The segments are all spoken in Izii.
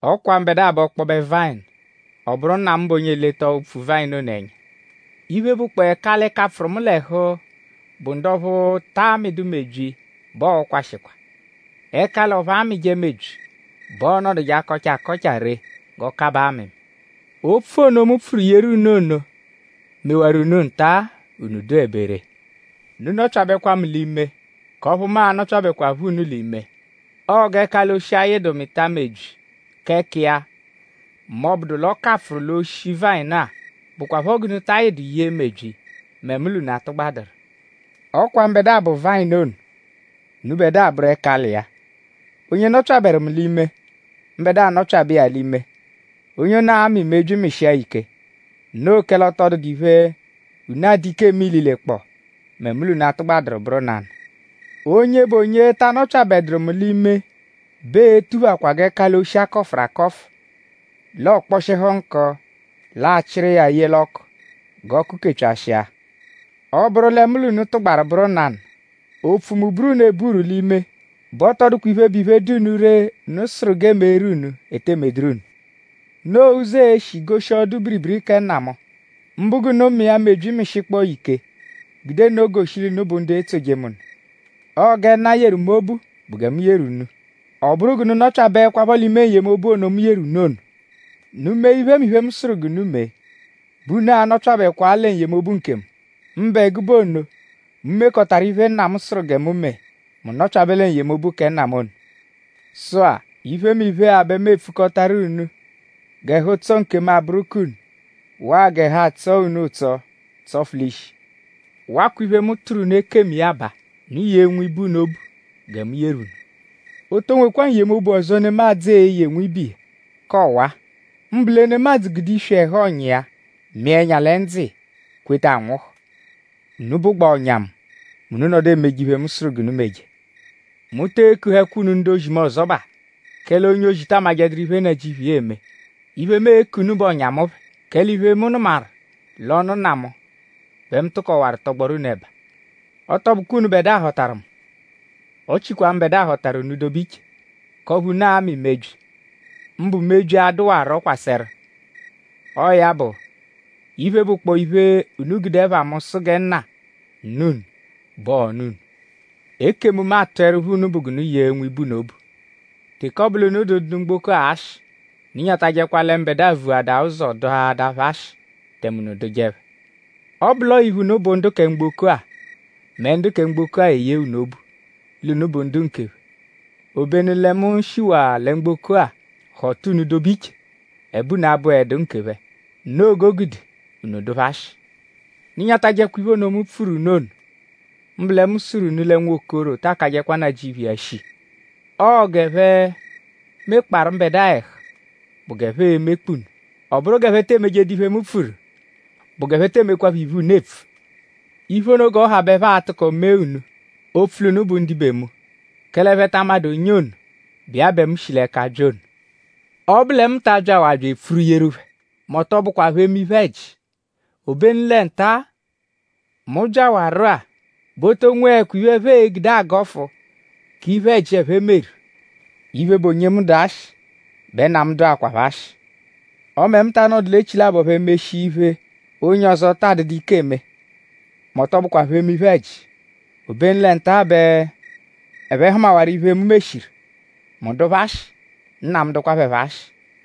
“Ọ kwa mbẹdua bụ ọkpobe vayịnu; ọ bụru Nna mu bụ onye eleta opfu-vayịnu ono ẹnya. Iphe, bụkpoo ẹkali, kapfụru mu l'ẹhu, bụ ndu ọphu ta amịdu mebyi bẹ ọo-kwashikwa. Ẹkali ọphu amịje mebyi bẹ ọonoduje akọcha akọcha ree g'ọokabaa amịmi. Opfu ono, mu pfuru yeru unu ono mewaru unu nta-a; unu dụebe ree. Unu nọpyabekwa mu l'ime; k'ọphu mu a-nọpyabekwapho unu l'ime. Ọo g'ẹkali-oshi ayịdu mịta mebyi k'ẹka iya m'ọ -bụdu l'ọ kapfụru l'oshi vayịnu-a; bụkwapho g'unu ta ayịdu yee mebyi mẹ mu l'unu atụgbaduru. “Ọ kwa mbẹdua bụ vayịnu ono; unubẹdua bụru ẹkali iya. Onye nọpyaberu mu l'ime; mbẹdua nọpyabe iya l'ime; onye ono a-mị mebyi mịshia ya ike; noo kẹle ọ tọ dụdu iphe, unu adụ ike eme ililekpọo; mẹ mu l'unu atụgbaduru bụru nanụ. Onye bụ onye ta anọpyabeduru mu l'ime bẹ ee-tuphakwa g'ẹkali-oshi, a kọfuru akọfu; l'ọ kpọshihu nkụ; l'a chịru iya ye l'ọku; g'ọku kepyashịa. Ọ -bụru lẹ mu l'unu tụgbaru bụru nanụ; opfu mu buru unu eburu l'ime bẹ ọ tọ dụkwa iphe, bụ iphe, dụ unu ree, unu sụru g'e meeru unu, e tee medụru unu. Noo ụzo, ee-shi goshi ọdu-biribiri kẹ Nna mu; mbụ g'unu mịa mebyi mịshikpoo ya ike gude nno goshi l'unu bụ ndu etsoje mu nụ. Ọo gẹ Nna mu yeru mu obu bụ gẹ mu yeru unu. Ọ bụru g'unu nọpyabeekwapho l'ime n-yemobu ono, mu yeru unu ono. Unu -mee iphemiphe, mu sụru g'unu mee bẹ unu a-nọpyabekwaa lẹ n-yemobu nkemu; mbụ ẹgube ono, mu mekọtaru iphe, Nna mu sụru gẹ mu mee; mu nọpyabe lẹ n-yemobu kẹ Nna mu ono. “Sụ-a; iphemiphe-a bẹ mu epfukọtaru unu g'ẹhu-ụtso nkemu abụru k'unu; waa g'ẹhu atsọo unu ụtso tsọfu l'ishi. Wakwa iphe, mu tụru unu ekemu iya baa; unu yee nwibe unu obu gẹ mu yeru unu. O to nwekwa n-yemobu ọzo, nemadzụ e-ye nwibe iya, ka ọwa-a; mbụ lẹ nemadzụ gude iswi ẹhu ọ̀nyà iya; mịa ẹnya lẹ ndzụ iya kweta anwụhu. Unu bụgbaa ọ̀nyà mu mẹ unu -nọdu emeje iphe, mu sụru g'unu meje. Mu tee kuhẹkwa unu ndu-ozi mu ọzobaa; kẹle onye-ozi ta amajẹduru iphe, nnajịuphu iya eme. Iphe, mu e-ku unu bụ ọ̀nyà mu phẹ; kẹle iphe, mu nụmaru l'ọnu Nna mu bẹ mu tụkowaru tọgboru unu ẹba. Ọ tọ bụkwa unubẹdua họtaru mu; ọ chikwa mbẹdua họtaru unu dobe iche; k'ọphu unu a-mị mebyi; mbụ mebyi, a-dụwaro kwasẹru. Ọo ya bụ; iphe, bụkpoo iphe, unu gude ẹpha mu sụ gẹ Nna nụ unu bẹ ọo-nụ unu. Ekemu, mu atụerupho unu bụ g'unu yee nwibe unu obu.” “Teke ọ bụ l'unu dụ ndu mgboko-a ashị; unu nyatajẹkwa lẹ mbẹdua vuadaa ụzo dụhaadaa phẹ ashị; tẹme unu dụje phẹ. Ọ -bụ l'ọo iphe, unu bụ ndu kẹ mgboko-a mẹ ndu kẹ mgboko-a eyee unu obu; l'unu bụ nkephẹ. Obenu lẹ mu shiwaa lẹ mgboko-a họta unu dobe iche; ẹbe unu abụedu nkephẹ. Noo g'o gude unu dụ phẹ ashị. Unu nyatajẹkwa iphe ono, mu pfuru unu ono; mbụ lẹ mu sụru unu lẹ nwokoro ta akajẹdu nnajịuphu iya shii. Ọo g'ẹphe mekparu mbẹdua ẹhu bụ g'ẹphe e-mekpa unu. Ọ bụru g'ẹphe te emejedu iphe, mu pfuru bụ g'ẹphe tee mekwaphọ iphe, unu epfu. Iphe ono g'ọ ha bẹ ẹphe a-tụko mee unu; opfu l'unu bụ ndibe mu; kẹle ẹphe ta amadụ onye ono, bụ iya bẹ mu shi l'ẹka bya ono. Ọ -bụ lẹ mu ta abyawaa bya epfuru yeru phẹ mẹ ọ tọ bụkwa phẹ eme iphe-ẹji; obenu lẹ nta-a, mu byawaru-a bẹ o to nweẹkwa iphe, ẹphe gude agọfu k'iphe-ẹji, ẹphe meru. Iphe, bụ onye mu dụ ashị bẹ Nna mu dụakwapho ashị. Ọme mu ta anọdu l'echilabọ phẹ meshia iphe, onye ọzo taa dụdu ike eme; mẹ ọ tọ bụkwa phẹ eme iphe-ẹji. Obenu lẹ nta-a bẹ ẹphe hụmawaru iphe, mu meshiru; mu dụ phẹ ashị; Nna mu dụkwa phẹ phọ ashị.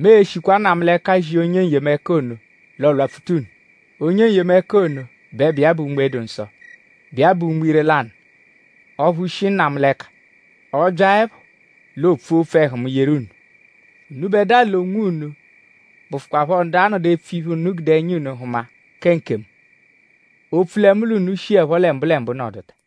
“Mu e-shikwa Nna mu l'ẹka zia Onye N-yemẹka ono; l'ọ lwapfuta unu. Onye N-yemẹka ono bẹ bụ iya bụ Unme-dụ-Nsọ, bụ iya bụ Unme ire-lanụ ọphu shi Nna mu l'ẹka. Ọ -byaẹpho l'o pfua opfu ẹhu mu yeru unu. Unubẹdua l'onwunu bụfukwaapho ndu a-nọdu epfu iphe, unu gude ẹnya unu hụma kẹ nkemu; opfu lẹ mu l'unu shiẹpho lẹ mbụlembu nọduta.